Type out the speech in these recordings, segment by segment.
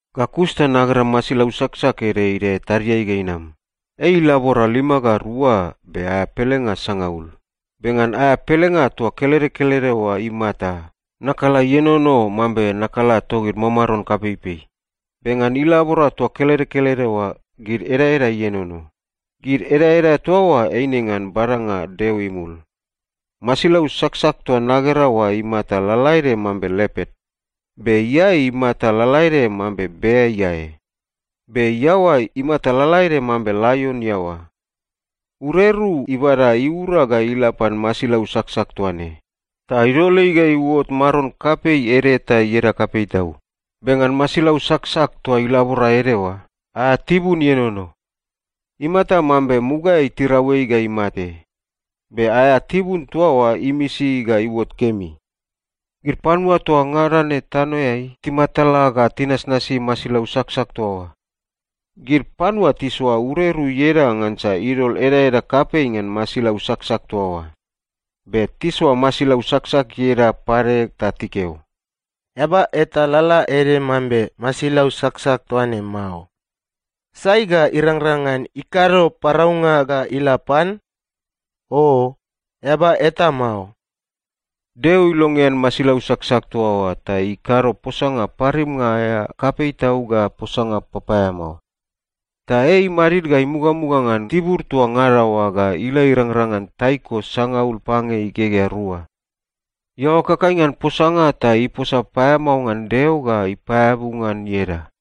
Ga kus ta nagera masilau saksak ede idae tadiai ga inam. Ei ilabora lima ga rua be aea pelenga sangaul. Be ngan aea pelenga toa kelede kelede oa imata, nakala ienono mambe nakala togid mamaron kapeipei. Be ngan ilabora toa kelede kelede oa, gid edaeda ienono. Gid edaeda toa oa eine ngan badanga Deo imul. Masilau saksak toa nagera oa imata lalaede mambe lepat. Be iae imata lalaede mambe bea iae. Be iaoa imata lalaede mambe laion iaoa. Ureru ibada iura ga ila pan masilau saksak toa ne, ta idol ei ga iuot maron kapei ede ta ieda kapei tau. Be ngan masilau saksak toa ilabora ede oa, aea tibun ienono. Imata mambe mugaeai tirau ei ga imate, be aea tibun toa oa imisi ga iuot kemi. Gid panua toa ngada ne tanoeai timatala ga tinasnasi masilau saksak toa oa. Gid panua tisoa ureru ieda ngansa idol edaeda kapei ngan masilau saksak toa oa. Be tisoa masilau saksak ieda pade ta tikeo, “Eaba eta lalaede mambe masilau saksak toa ne mao! Sai ga irangrang ngan ikado paraunga ga ila pan? Oo, eaba eta mao!” Deo ilongean masilau saksak toa oa ta ikado posanga parimnga aea kapei tau ga posanga papaeamao. Ta ei imadid ga imugamuga ngan tibur toa ngada oa ga ila irangrang ngan taiko sangaul pange igegea rua. Iaoa ikakai ngan posanga ta iposa paeamao ngan Deo ga ipaeabu ngan ieda.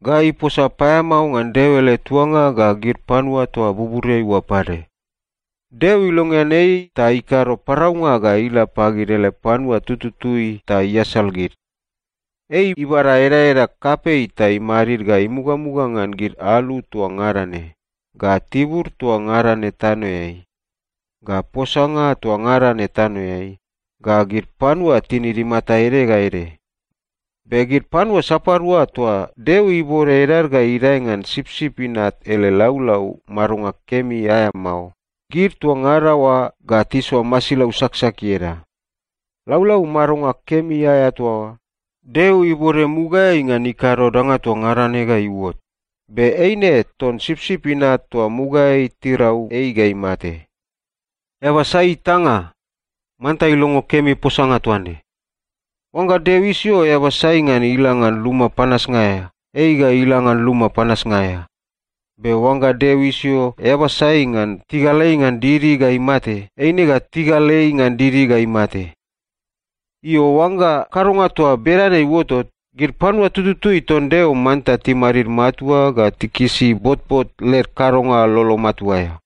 Ga iposa paeamao ngan Deo ele tuanga ga gid panua toa buburiai oa pade. Deo ilongean ei ta ikado paraunga ga ila pagid ele panua tututui ta iasal gid. Ei ibada edaeda kapei ta imadid ga imugamuga ngan gid alu toa ngada ne, ga tibur toa ngada ne tanoeai, ga posanga toa ngada ne tanoeai, ga gid panua tinid imata ede ga ede. Be gid panua sapadua toa Deo ibode edad ga idae ngan Sipsip Inat ele laulau madonga kemi aea mao, gid toa ngada oa ga tisoa masilau saksak ieda. Laulau madonga kemi aea toa oa, Deo ibode mugaeai ngan ikado danga toa ngada ne ga iuot. Be eine ton Sipsip Inat toa mugaeai tirau ei ga imate. Eaba sai itanga, manta ilongo kemi posanga toa ne. Oangga Deo isio eaba sai ngan ila ngan luma panasnga aea, ei ga ila ngan luma panasnga aea. Be oangga Deo isio eaba sai ngan tigal ei ngan didi ga imate, eine ga tigal ei ngan didi ga imate. Io, oangga kadonga toa bedane iuotot, gid panua tututui ton Deo manta timadid matua ga tikisi botbot led kadonga lolo matua aea.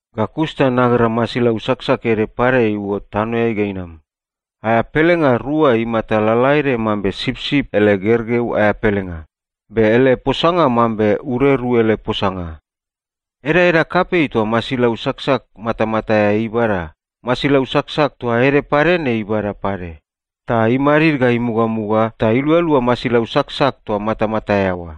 Ga kus ta nagera masilau saksak ede pade iuot tanoeai ga inam. Aea pelenga rua imata lalaede mambe sipsip ele gergeu aea pelenga, be ele posanga mambe ureru ele posanga. Edaeda kapei toa masilau saksak matamata aea ibada, masilau saksak toa ede pade ne ibada pade, ta imadid ga imugamuga ta ilualua masilau saksak toa matamata aea oa.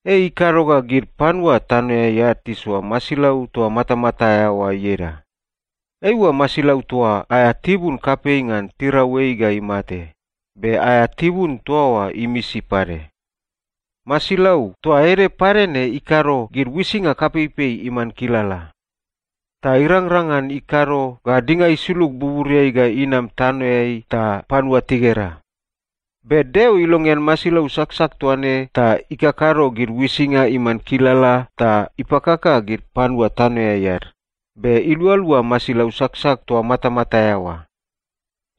Ei ikado ga gid panua tanoeai ad tisoa masilau toa matamata aea oa ieda. Eiua masilau toa aea tibun kapei ngan tirau ei ga imate, be aea tibun toa oa imisi pade. Masilau toa ede pade ne ikado gid uisinga kapeipei iman kilala. Ta irangrang ngan ikado ga dinga isulug buburiai ga inam tanoeai ta panua tigera. Be Deo ilongean masilau saksak toa ne ta ikakado gid uisinga iman kilala ta ipakaka gid panua tanoeai ad, be ilualua masilau saksak toa matamata aea oa.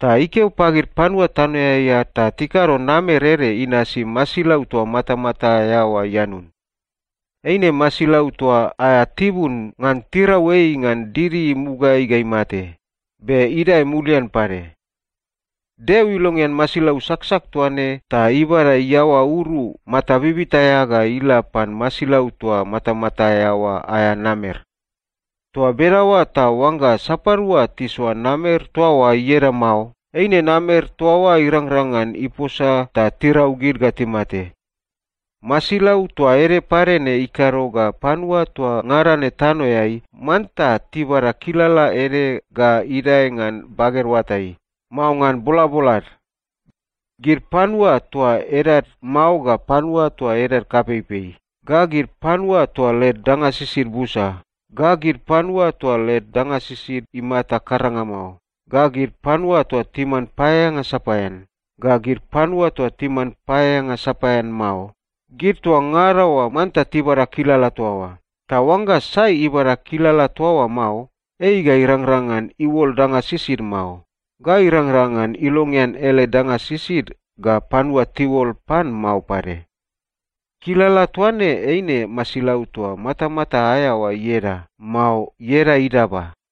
Ta ikeo pagid panua tanoeai ad ta tikado namer ede inasi masilau toa matamata aea oa ianun. Eina masilau toa aea tibun ngan tirau ei ngan didi mugaeai ga imate, be idae mulian pade. Deo ilongean masilau saksak toa ne ta ibada iaoa uru mata bibita aea ga ila pan masilau toa matamata aea oa aea namer. Toa bedaoa ta oangga sapadua tisoa namer toa oa ieda mao, eine namer toa oa irangrang ngan iposa ta tirau gid ga timate. Masilau toa ede pade ne ikado ga panua toa ngada ne tanoeai manta tibada kilala ede ga idae ngan baged oatai, mao ngan bolabolad. Gid panua toa edad mao ga panua toa edad kapeipei, ga gid panua toa led danga sisid busa, ga gid panua toa led danga sisid imata karanga mao, ga gid panua toa timan paeaeanga sapaean, ga gid panua toa timan paeaeanga sapaean mao, gid toa ngada oa manta tibada kilala toa oa. Ta oangga sai ibada kilala toa oa mao, ei ga irangrang ngan iuol danga sisid mao, ga irangrang ngan ilongean ele danga sisid ga panua tiuol pan mao pade. Kilala toa ne eine masilau toa matamata aea oa ieda, mao ieda idaba.